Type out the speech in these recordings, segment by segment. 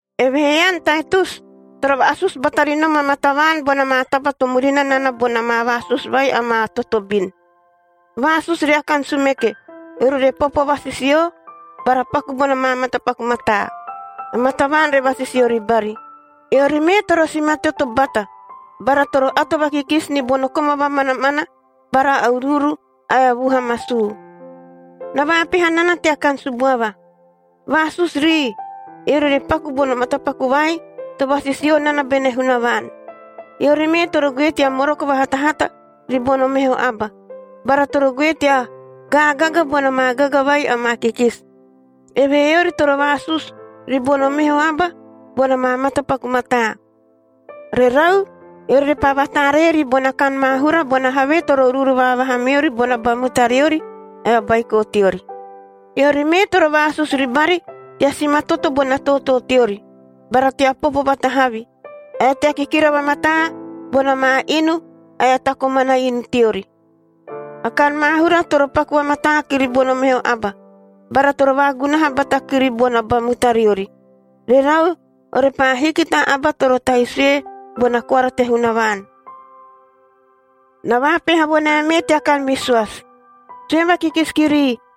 Evehee ean, Taitus, toro vaasusu bata ri nom amaa tavaan bona maa taba to murina nana bona maa vaasusu vai amaa totobin. Vaasusu ria kan sumeke, eori re popo vasisio bara paku bona maa matapaku mataa, amaa tavaan re vasisio ribari. Eori mee toro simatoto bata, bara toro ato vakikisi ni bono koma vamanamana bara uruuru ae vuha masuu. Na vaapeha nana tea kan subuava. Vaasusu rii, eori re paku bono matapaku vai to vasisio nana bene Hunavaan. Eori mee toro goe tea moroko vahatahata ribono meho aba, bara toro goe tea gaagaga bona maa gaga vai amaa kikisi. Evehee eori toro vaasusu ribono meho aba bona maa matapaku mataa. Rerau, eori repaa vataaree ribona kan maahura bona havee toro uruuru vaavaha meori bona ba mutariori ae o baiko teori. Eori mee toro vaasusu ribari tea simatoto bona tootoo teori, bara tea popo vatahavi, ae tea kikira vamataa bona maa inu ae a ta komana inu teori. A kan maahura toro paku vamataa kiri bono meho aba bara toro vaagunaha bata kiri bona ba mutariori. Rerau, orepaa hiki ta aba toro tahi sue bona koara te Hunavaan. Na vaapeha vo nae mee tea kan visoasi. Sue vakikisi kirii,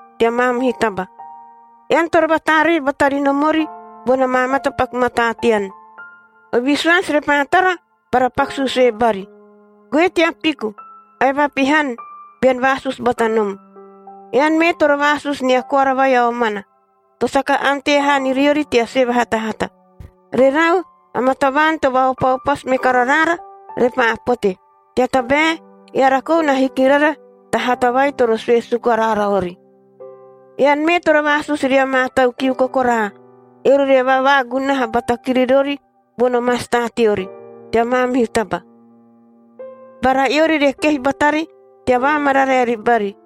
tea maamihu taba. Ean toro vataaree bata ri nomori bona maa matapaku mataa tean, o visoasi repaa tara bara paku suusue bari. Goe tea piku ae vapihan bean vaasusu bata nom. Ean mee toro vaasusu nia koara vai a omana, to saka ante haa ni riori tea sue vahatahata. Rerau, amaa tavaan to vaopaopasu me kara raara repaa pote, tea tabae eara kou na hiki rara ta hata vai toro sue suku araara ori. Ean mee toro vaasusu ria maa tau kiu kokoraa, eori re vavaagunaha bata kiri rori bono masta teori tea maamihu taba, bara eori re kehi batari tea vaamararae ribari.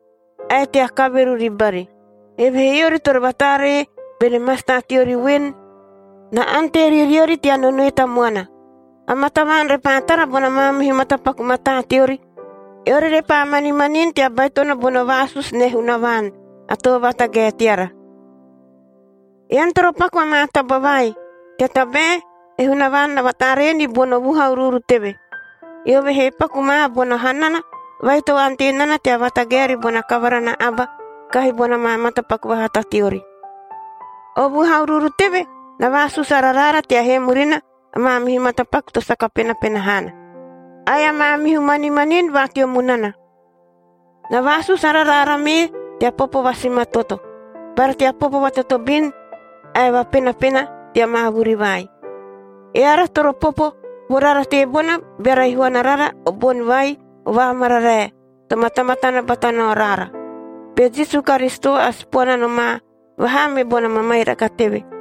ae tea kaveru ribari. Evehee eori toro vataaree bene masta teori voen, na ante ri riori tea nonoe tamuana. Amaa tavaan repaa tara bona maamihu matapaku mataa teori, eori repaa manimanini tea baitono bono vaasusu ne Hunavaan a Too Vatagae teara. Ean toro paku amaa taba vai, tea tabae e Hunavaan na vataaree ni bono vuha uruuru teve, eove he paku ma bona hanana vai to ante nana tea vatagae ribona kavara na aba kahi bona maa matapaku vahata teori. O vuha uruuru teve na vaasusu ara raara tea hee murina a maamihu matapaku to saka penapena haana ae a maamihu manimanini va teo munana. Na vaasusu ara raara mee tea popo vasimatoto, bara tea popo vatotobin ae vapenapena tea maa vuri vai. Eara toro popo vo rara teebona, beara ihuana rara o boni vai o vaamararae to matamatana bata nao raara, be Jisu Karisito a Sipoana nomaa vaha me bona mamairaka teve.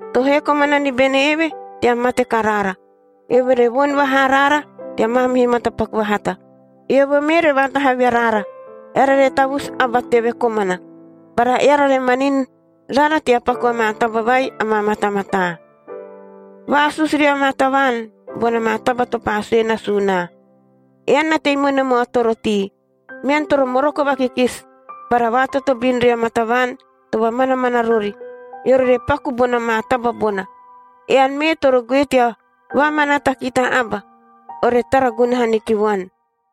to hee komana ni bene eve tea mate karaara, eove re voni vaha araara tea maamihu matapaku vahata. Eove mee re vatahavi araara, eara re tavusu aba teve komana, bara eara re manini rara tea paku amaa taba vai amaa matamataa. Vaasusu ria maa tavaan bona maa taba to paa sue nasuu naa. Ean na tei me nom o atorotii, mean toro moroko vakikisi bara vaatotobin ria maa tavaan to vamanamana rori, eori re paku bona maa taba bona. Ean mee toro goe tea vaamanaata ki ta aba ore tara gunaha ni ki vuan.